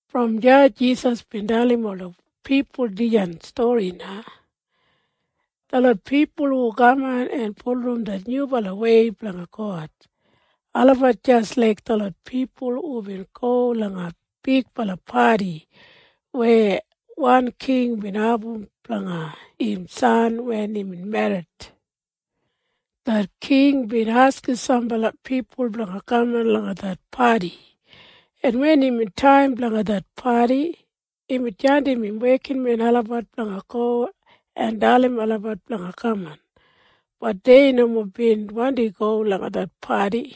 Brom deya Jisas bin dalim ola pipul dijan stori na, “Detlot pipul hu kaman en bulurrum det Nyubalawei blanga God, olabat jis laik detlot pipul hubin go langa bigbala padi weya wan king bin abum blanga im san wen imbin merrit. Det king bin askim sambala pipul blanga kaman langa det padi, en wen imbin taim blanga det padi, imbin jandim im wekinmen olabat blanga go en dalim olabat blanga kaman. Bat dei nomo bin wandi go langa det padi.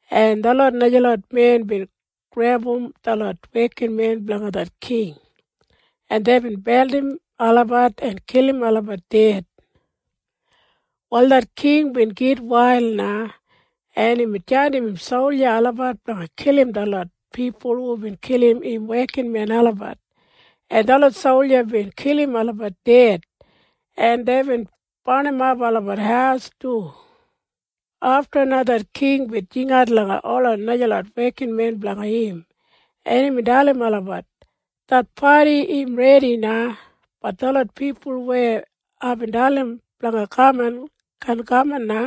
En detlot najalot men bin grebum detlot wekinmen blanga det king, en deibin beldim olabat en kilim olabat ded. “Wal det king bin gitwail na, en imbin jandim im solja olabat blanga kilim detlot pipul hubin kilim im wekinmen olabat, en detlot solja bin kilim olabat ded, en deibin barnimap olabat haus du. Afta na det king bin jingat langa ola najalot wekinmen blanga im, en imbin dalim olabat, ‘Det padi im redi na. Bat detlot pipul weya aibin dalim blanga kaman kaan kaman na,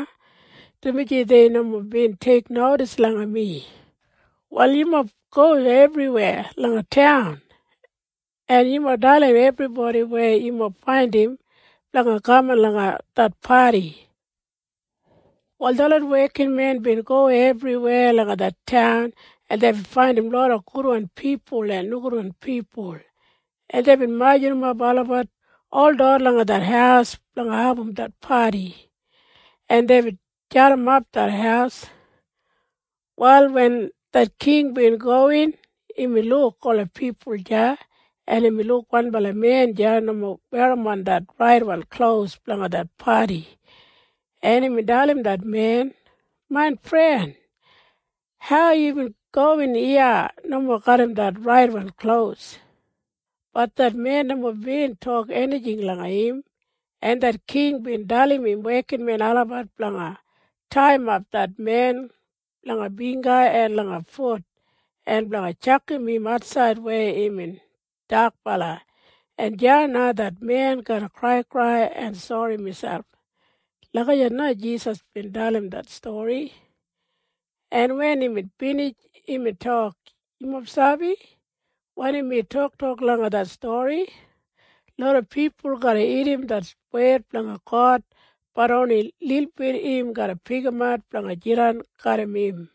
dumaji dei nomo bin teiknodis langa mi. Wal yumob go ebriweya langa taun, en yumob dalim ebribodi weya yumob faindim blanga kaman langa det padi.’ “Wal detlot wekinmen bin go ebriweya langa det taun, en deibin faindim loda gudwan pipul en nogudwan pipul, en deibin majurrumap olabat holot langa det haus blanga abum det padi, en deibin jadimap det haus. “Wal wen det king bin gowin, imbin luk ola pipul deya, en imbin luk wanbala men deya nomo werrimon det raitwan klos blanga det padi, en imbin dalim det men, ‘Main fren, hau yubin gowin iya nomo garram det raitwan klos?’ Bat det men nomo bin tok enijing langa im, en det king bin dalim im wekinmen olabat blanga taiyimap det men langa bingga en langa fut en blanga tjakam im atsaid weya imbin dakbala, en deya na det men garra kraikrai en sori miselp.” Lagijat na Jisas bin dalim det stori, en wen imbin binij, imbin tok, “Yumob sabi wanim mi tok langa dijan stori? Loda pipul garra irrim det wed blanga God. Bat oni lilbit im garra pikimat blanga jidan garram im.”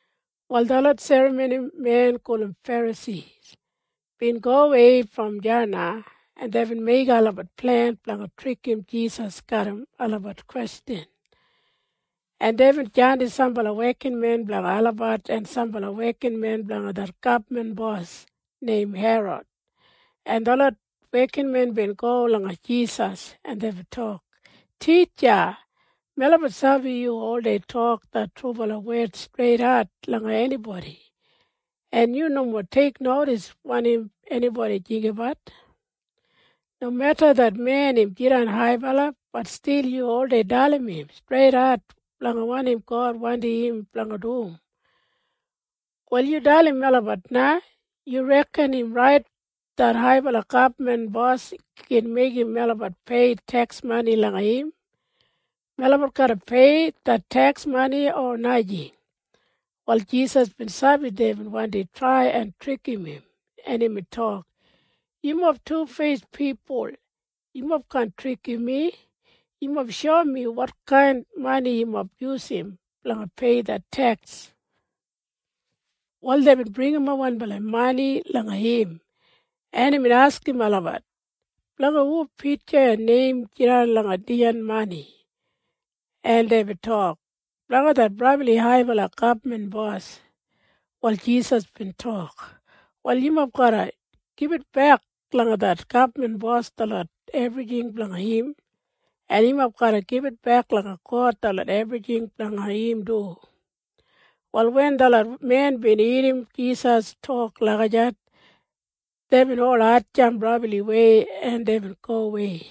Wal detlot serramonimen gulum Ferasi bin gowei brom deya na, en deibin meigim olabat plen blanga trikim Jisas garram olabat kwestjan, en deibin jandim sambala wekinmen blanga olabat en sambala wekinmen blanga det gabman bos neim Herod, en detlot wekinmen bin go langa Jisas, en deibin tok, “Titja, melabat sabi yu oldei tok det trubala wed streidat langa enibodi, en yu nomo teiknodis wanim enibodi jinggabat. Nomeda det men im jidan haibala. Bat stil yu oldei dalim im streidat blanga wanim God wandim im blanga dum. Wal yu dalim melabat na. Yu reken im rait det haibala gabman bos gin meigim melabat peiyim teks mani langa im? Melabat garra pei det teks mani o najing?” Wal Jisas bin sabi deibin wandi trai en trikim im, en imbin tok, “Yumob tufeis pipul. Yumob kaan trikim mi. Yumob shoum mi wotkain mani yumob yusum blanga pei det teks.” Wal deibin bringimap wanbala mani langa im, en imbin askim olabat, “Blanga hu pitja en neim jidan langa dijan mani?” En deibin tok, “Blanga det brabli haibala gabman bos neim Sisa.” Wal Jisas bin tok, “Wal yumob garra gibitbek langa Sisa detlot enijing blanga im, en yumob garra gibitbek langa God detlot enijing blanga im du.” Wal wen detlot men bin irrim Jisas tok lagijat, deibin ol hatjamp brabliwei, en deibin gowei.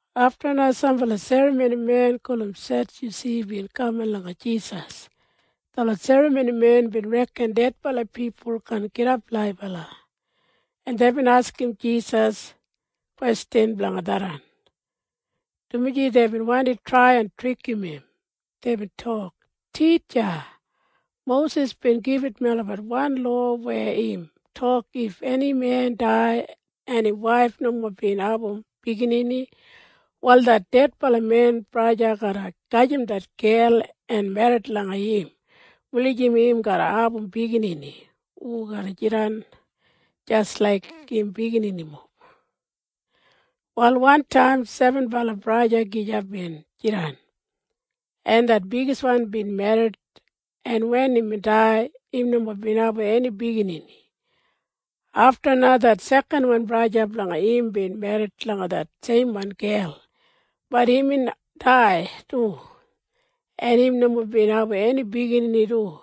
Afta na sambala serramonimen gulum Sedyusi bin kaman langa Jisas. Detlot serramonimen bin reken dedbala pipul kaan gidap laibala, en deibin askim Jisas kwestjan blanga tharran, dumaji deibin wandi trai en trikim im. Deibin tok, “Titja, Mosis bin gibit melabat wan lowa weya im tok if eni men dai en im waif nomo bin abum biginini, wal det dedbala men braja garra gajim det gel en merrit langa im wulijim im garra abum biginini hu garra jidan jis laik im bigininimob. “Wal wantaim sebenbala braja gija bin jidan, en det bigiswan bin merrit, en wen imbin dai, im nomo bin abum eni biginini. Afta na det sekanwan braja blanga im bin merrit langa det seimwan gel. Bat imbin dai du, en im nomo bin abum eni biginini du.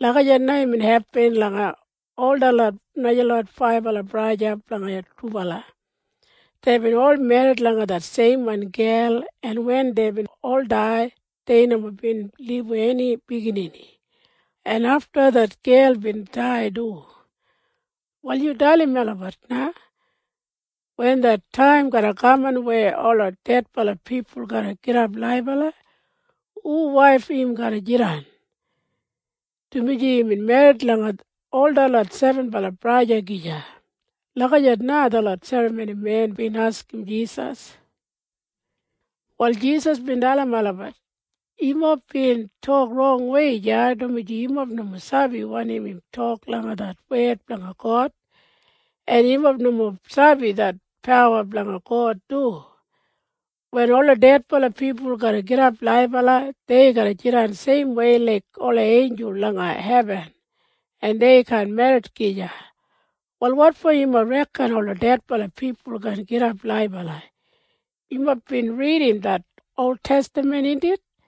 Lagijat na imbin hepin langa ol detlot najalot faibala braja blanga dubala. Deibin ol merrit langa det seimwan gel, en wen deibin ol dai, dei nomo bin libum eni biginini. En afta det gel bin dai du. “Wal yu dalim melabat na. Wen det taim garra kaman weya ola dedbala pipul garra gidap laibala, hu waif im garra jidan? Dumaji imbin merrit langa ol detlot sebenbala braja gija.” Lagijat na detlot serramonimen bin askim Jisas. Wal Jisas bin dalim olabat, “Yumob bin tok rongwei deya, dumaji yumob nomo sabi wanim im tok langa wed blanga God, en yumob nomo sabi det pawa blanga God du. Wen ola dedbala pipul garra gidap laibala, dei garra jidan seimwei laik ola einjul langa hebin, en dei kaan merrit gija. Wal wotfo yumob reken ola dedbala pipul kaan gidap laibala? Yumob bin ridim det oltestaman, indit?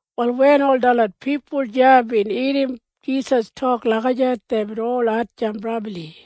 Wal wen ol detlot pipul deya bin irrim Jisas tok lagijat, deibin ol hatjamp brabli.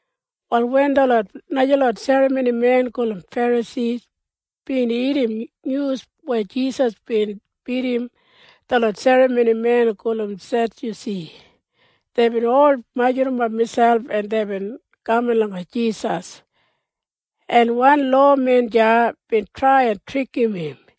Wal wen detlot najalot serramonimen gulum Ferasi bin irrim nyus weya Jisas bin bidim detlot serramonimen gulum Sedyusi, deibin ol majurrumap miselp, en deibin kaman langa Jisas, en wan lowamen deya bin trai en trikim im.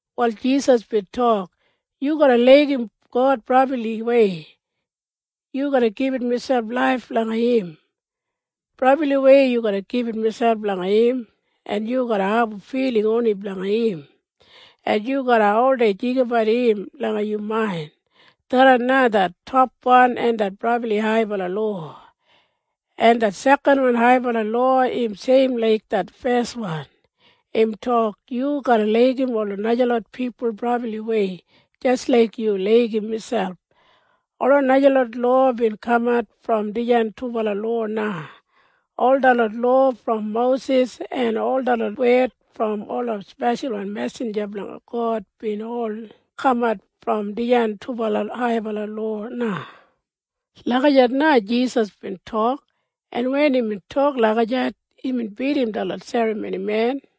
Wal Jisas bin tok, “‘Yu garra laigim God brabliwei. Yu garra gibit miselp laif langa im. Brabliwei yu garra gibit miselp langa im, en yu garra abum filing oni blanga im, en yu garra oldei jinggabat im langa yu main.’ Tharran na det topwan en brabli haibala lowa. En det sekanwan haibala lowa im seim laik det feswan. Im tok, ‘Yu garra laigim ola najalot pipul brabliwei jis laik yu laigim miselp.’ Ola najalot lowa bin kamat brom dijan dubala lowa na. Ol detlot lowa brom Mosis en ol detlot wed brom ola speshalwan mesinja blanga God bin ol kamat brom dijan dubala haibala lowa.” Lagijat na Jisas bin tok, en wen imbin tok lagijat, imbin bidim detlot serramonimen.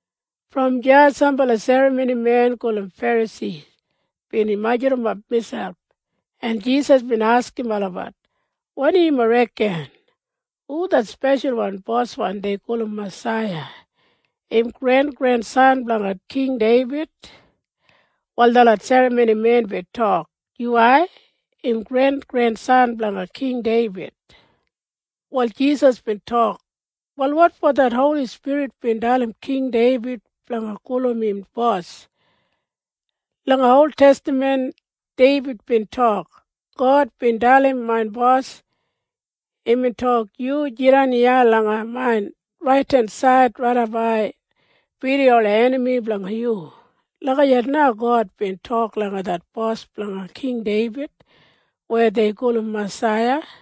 Brom deya sambala serramonimen gulum Ferasi bin majurrumap miselp, en Jisas bin askim olabat, “Wanim yumob reken? Hu det speshalwan Bos dei gulum Masaiya? Im grengrensan blanga King Deibid?” Wal detlot serramonimen bin tok, “Yuwai, im grengrensan blanga King Deibid.” Wal Jisas bin tok, “Wal wotfo det Holi Spirit bin dalim King Deibid blanga gulum im Bos? Langa oltestaman Deibid bin tok, ‘God bin dalim main Bos, Yu jidan iya langa main raidensaid raidap ai bidim ola enami blanga yu.’ Lagijat na God bin tok langa det Bos blanga King Deibid weya dei gulum Masaiya.”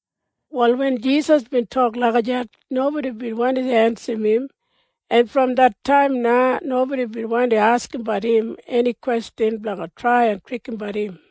Wal wen Jisas bin tok lagijat, nobodi bin wandi ensim im, en brom det taim na nobodi bin wandi askimbat im eni kwestjan blanga trai en trikimbat im.